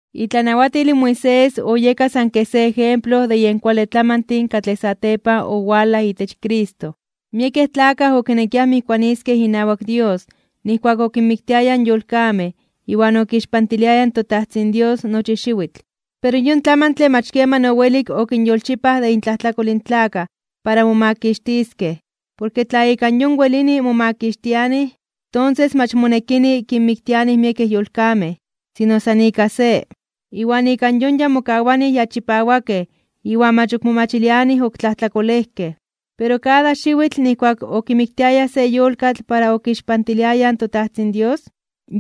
Itlanawatil in Moisés oyeka san se ejemplo de yen kuale tlamantin katlej satepan owalaj itech Cristo. Miekej tlakaj okinekiaj mijkuaniskej inawak Dios nijkuak okinmiktiayaj yolkamej iwan okixpantiliayaj in toTajtzin Dios nochi xiwitl. Pero yon tlamantle mach keman owelik okinyolchipaj de intlajtlakol in tlakaj para momakixtiskej. Porke tla ika yon welini momakixtianij, tonses mach monekini kinmiktianij miekej yolkamej, sino san ika se. Iwan ika yon ya mokawanij ya chipawakej iwan mach ok momachilianij ok tlajtlakolejkej. Pero kada xiwitl nijkuak okimiktiayaj se yolkatl para okixpantiliayaj in toTajtzin Dios,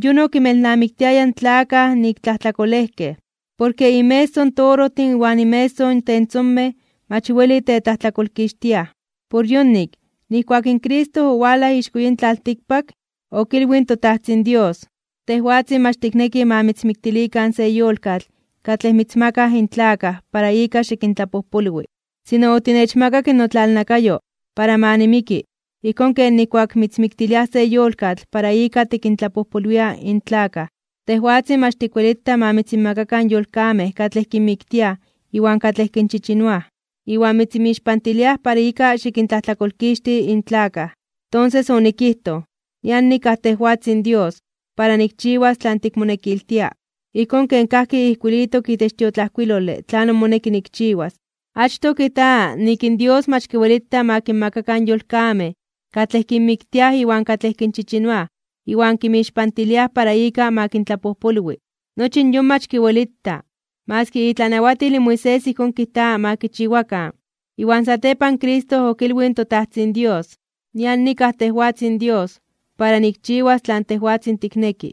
yon okinmelnamiktiaya in tlakaj nik tlajtlakolejkej. Porke inmeso in torojtin iwan inmeso tentzonkonemej mach weli tetlajtlakolkixtiaj. Por yonik, nijkuak in Cristo owalaj ixko yin tlaltikpak, okilwij in toTajtzin Dios: Tejwatzin mach tikneki ma mitzmiktilikan se yolkatl katlej mitzmakaj in tlakaj para ika xikintlapojpolwi. Sino otinechmakak notlalnakayo para ma nimiki ijkón ken nijkuak mitzmiktiliaj se yolkatl para ika tikintlapojpolwia in tlakaj. Tejwatzin mach tikwelita ma mitzinmakakan yolkamej katlej kinmiktiaj iwan katlej kinchichinoaj, iwan mitzinmixpantiliaj para ika xikintlajtlakolkixti in tlakaj. Tonses onikijtoj: “Nian nikaj tejwatzin Dios, para nikchiwas tlan tikmonekiltia, ijkón ken kajki ijkuilitok itech tiotlajkuilole tlanon moneki nikchiwas.” Achtoj kijta nik in Dios mach kiwelita ma kinmakakan yolkamej katlej kinmiktiaj iwan katlej kinchichinoaj iwan kinmixpantiliaj para ika ma kintlapojpolwi. Nochi in yon mach kiwelita. Maski itlanawatil in Moisés ijkón kijta ma kichiwakan. Iwan satepan Cristo okilwij in toTajtzin Dios: “Nian nikaj tejwatzin Dios, para nikchiwas tlan tejwatzin tikneki.”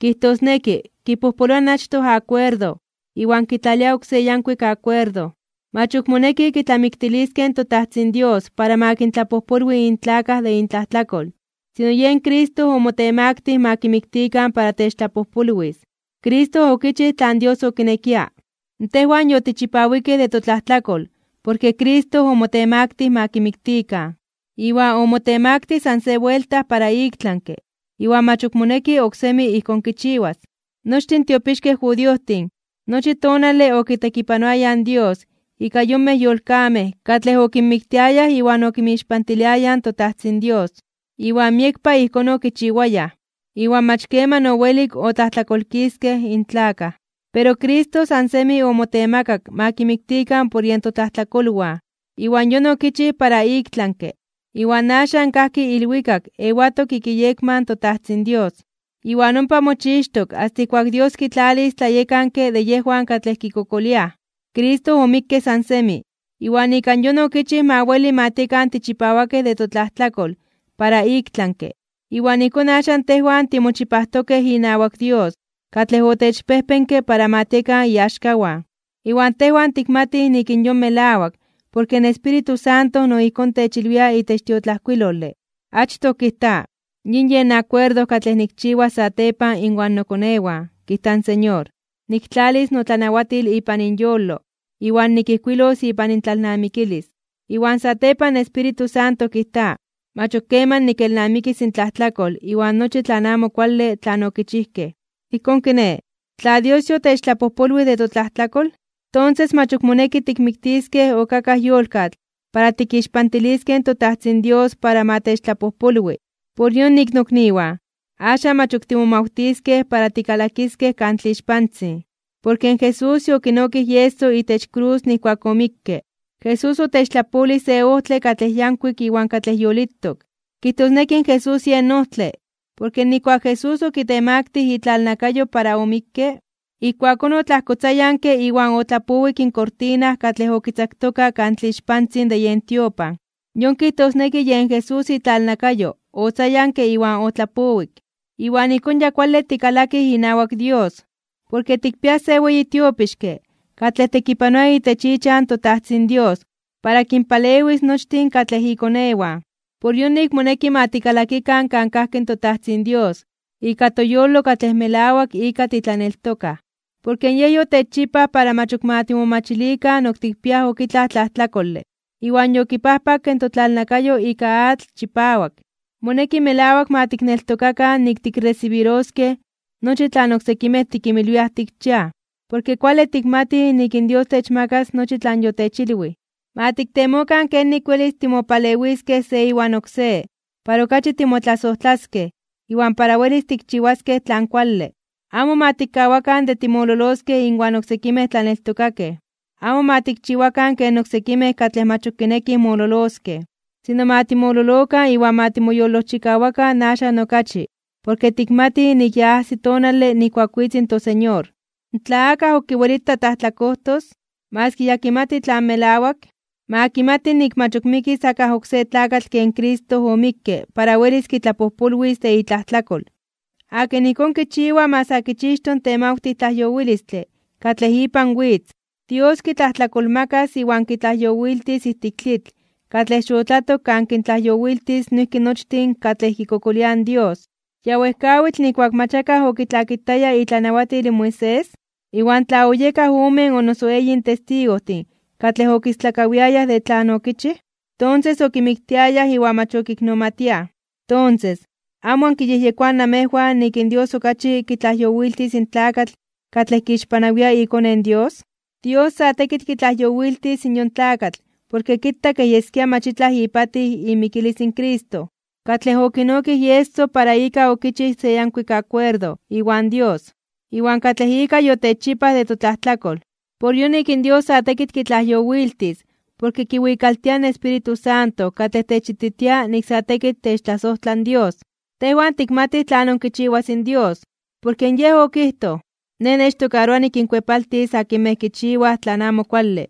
Kijtosneki, kipojpoloa in achtoj akuerdo iwan kitlalia oksé yankuik akuerdo. Mach ok moneki kitlamiktiliskej in toTajtzin Dios para ma kintlapojpolwi in tlakaj de intlajtlakol, sino yen Cristo omotemaktij (omotemaktilij) ma kimiktikan para techtlajpojpolwis. Cristo okichij tlan Dios okinekia. Tejwan yotichipawikej de totlajtlakol porke Cristo omotemaktij ma kimiktikan. Iwan omotemaktij san se buelta para iktlanke (ik tlami) iwan mach ok moneki oksemi ijkón kichiwas. Nochtin tiopixkej judiojtin nochi tonale okitekipanoayaj in Dios ika yonmej yolkamej katlej okinmiktiayaj iwan okinmixpantiliayaj in toTajtzin Dios. Iwan miekpa ijkón okichiwayaj, iwan mach keman owelik otlajtlakolkiskej in tlakaj. Pero Cristo san semi omotemakak ma kimiktikan por yen totlajtlakolwan. Iwan yon okichij para iktlanke (ik tlami). Iwan axan kajki ilwikak ewatok ik iyekma in toTajtzin Dios. Iwan ompa mochixtok asta ijkuak Dios kitlalis tlayekanke de yejwan katlej kikokoliaj. Cristo omikke san semi, iwan ika yon okichij ma weli ma tiekan tichipawakej de totlajtlakol para iktlanke (ik tlami). Iwan ijkón axan tejwan timochipajtokej inawak Dios katlej otechpejpenke para ma tiekan iaxkawan. Iwan tejwan tikmatij nik in yon melawak porke in Espíritu Santo no ijkón techilwia itech tiotlajkuilole. Achtoj kijta: Yin yen akuerdo katlej nikchiwas satepan inwan nokonewan, kijta in Señor. Niktlalis notlanawatil ipan inyolo, iwan nikijkuilos ipan intlalnamikilis. Iwan satepan in Espíritu Santo kijta: Mach ok keman nikelnamikis intlajtlakol iwan nochi tlan amo kuale tlan okichijkej. Ijkón kiné, tla Dios yotechtlapojpolwij de totlajtlakol, tonses mach ok moneki tikmiktiskej ok akaj yolkatl para tikixpantiliskej toTajtzin Dios para ma techtlapojpolwi. Por yonik, nokniwan, axan mach ok timomawtiskej para tikalakiskej Kan Tlixpantzin, porke in Jesús yokinokij ieso itech krus nijkuak omikke. Jesús otechtlapolij se ojtle katlej yankuik iwan katlej yolitok, kijtosneki Jesús yen ojtle. Porke nijkuak Jesús okitemaktij (okitemaktilij) itlalnakayo para omikke, ijkuakón otlajkotzayanke iwan otlapowik in kortina katlej okitzaktoka Kan Tlixpantzin de yen tiopan. Yon kijtosneki yen Jesús itlalnakayo otzayanke iwan otlapowik. Iwan ijkón ya kuale tikalakij inawak Dios, porke tikpiaj se weyi tiopixke katlej tekipanoa itech ichan toTajtzin Dios para kinpalewis nochtin katlej ikonewan. Por yonik, moneki ma tikalakikan kan kajki in toTajtzin Dios ika toyolo katlej melawak ika titlaneltokaj. Porke Yej yotechchipaj para mach ok ma timomachilikan ok tikpiaj ok itlaj tlajtlakole, iwan yokipajpakke totlalnakayo ika atl chipawak. Moneki melawak ma tikneltokakan nik tikresibiroskej nochi tlan oksekimej tikinmilwiaj tikchiaj, porke kuale tikmatij nik in Dios techmakas nochi tlan yotechilwij. Ma tiktemokan kenik welis timopalewiskej se iwan oksé para okachi timotlasojtlaskej iwan para welis tikchiwaskej tlan kuale. Amo ma tikkawakan de timololoskej inwan oksekimej tlaneltokakej. Amo ma tikchiwakan ken oksekimej katlej mach ok kinekij mololoskej. Sino ma timololokan iwan ma timoyolojchikawakan axan okachi porke tikmatij nik ya ajsi tonale nijkuak witz in toSeñor. Tla akaj ok kiwelita tlajtlakojtos, maski ya kimati tlan melawak, ma kimati nik mach ok mikis akaj oksé tlakatl ken Cristo omikke para welis kitlapojpolwis de itlajtlakol. Akin ijkón kichiwa ma sa kichixto in temawtij tlajyowilistle katlej ipan witz. Dios kitlajtlakolmakas iwan kitlajyowiltis ijtik tlitl katlej xotlatok kan kintlajyowiltis noijki nochtin katlej kikokoliaj in Dios. Ya wejkawitl nijkuak akaj mach okitlakitaya itlanawatil in Moisés, iwan tla oyekaj omen o noso eyin testigojtin katlej okistlakawiayaj de tlan okichij, tonses okimiktiayaj iwan mach okiknomatiaj. Tonses, ¿amo ankiyejyekoaj namejwan nik in Dios okachi kitlajyowiltis in tlakatl katlej kixpanawia iKone in Dios? Dios sa tekitl kitlajyowiltis yon tlakatl porke kita kej yeskia mach itlaj ipatij imikilis in Cristo, katlej okinokij ieso para ika okichij se yankuik akuerdo iwan Dios, iwan katlej ika yotechchipaj de totlajtlakol. Por yonik in Dios sa tekitl kitlajyowiltis porke kiwikaltia in Espíritu Santo katlej techititia nik sa tekitl techtlasojtla in Dios. Tejwan tikmatij tlanon kichiwas in Dios, porke Yej okijtoj: “Nej nechtokaroa nikinkuepaltis akinmej kichiwaj tlan amo kuale,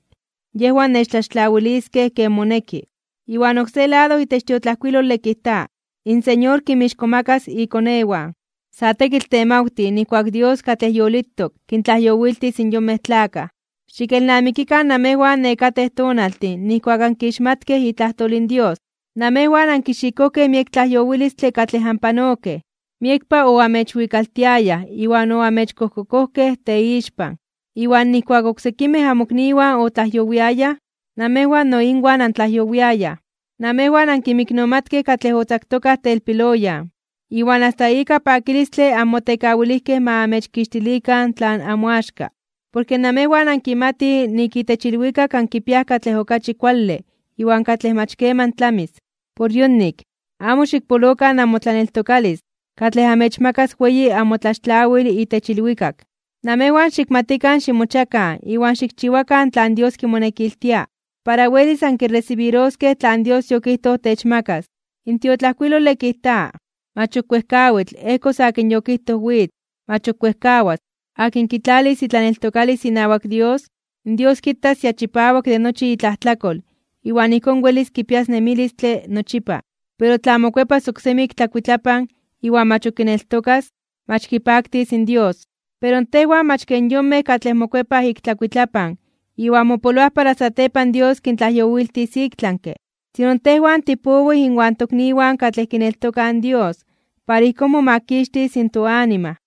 yejwan nechtlaxtlawiliskej ken moneki.” Iwan oksé lado itech tiotlajkuilole kijta: “In Señor kinmixkomakas (kintzonmanas) ikonewan.” Sa tekitl temawtij nijkuak in Dios katlej yolitok, kintlajyowiltis in yonmej tlakaj. Xikelnamikikan namejwan nekatej tonaltin nijkuak ankixmatkej itlajtol in Dios. Namejwan ankixikojkej miek tlajyowilistle katlej anpanokej. Miekpa oamechwikaltiayaj iwan oamechkojkokojkej teixpan, iwan nijkuak oksekimej amokniwan otlajyowiayaj, namejwan no inwan antlajyowiayaj. Namejwan ankinmiknomatkej katlej otzaktokaj telpiloyan. Iwan asta ika pakilistle anmotekawilijkej ma amechkixtilikan tlan namoaxka, porke namejwan ankimatij nik itech ilwikak ankipiaj katlej okachi kuale iwan katlej mach keman tlamis. Por yonik, amo xikpolokan namotlaneltokalis katlej amechmakas weyi amotlaxtlawil itech ilwikak. Namejwan xikmatikan ximochiakan iwan xikchiwakan tlan Dios kimonekiltia, para welis ankiresibiroskej tlan Dios yokijtoj techmakas. In tiotlajkuilole kijta: Mach ok wejkawitl ejkos akin yokijtoj witz, mach ok wejkawas. Akin kitlalis itlaneltokalis inawak Dios, in Dios kitas ya chipawak de nochi itlajtlakol iwan ijkón welis kipias nemilistle nochipa. Pero tla mokuepas oksemi ik tlakuitlapan iwan mach ok kineltokas, mach kipaktis in Dios. Pero tejwan mach ken yonmej katlej mokuepaj ik tlakuitlapan iwan mopoloaj para satepan Dios kintlajyowiltis iktlanke (ik tlami), sino tejwan tipowij inwan tokniwan katlej tikneltokaj Dios para ijkón momakixtis in toanima.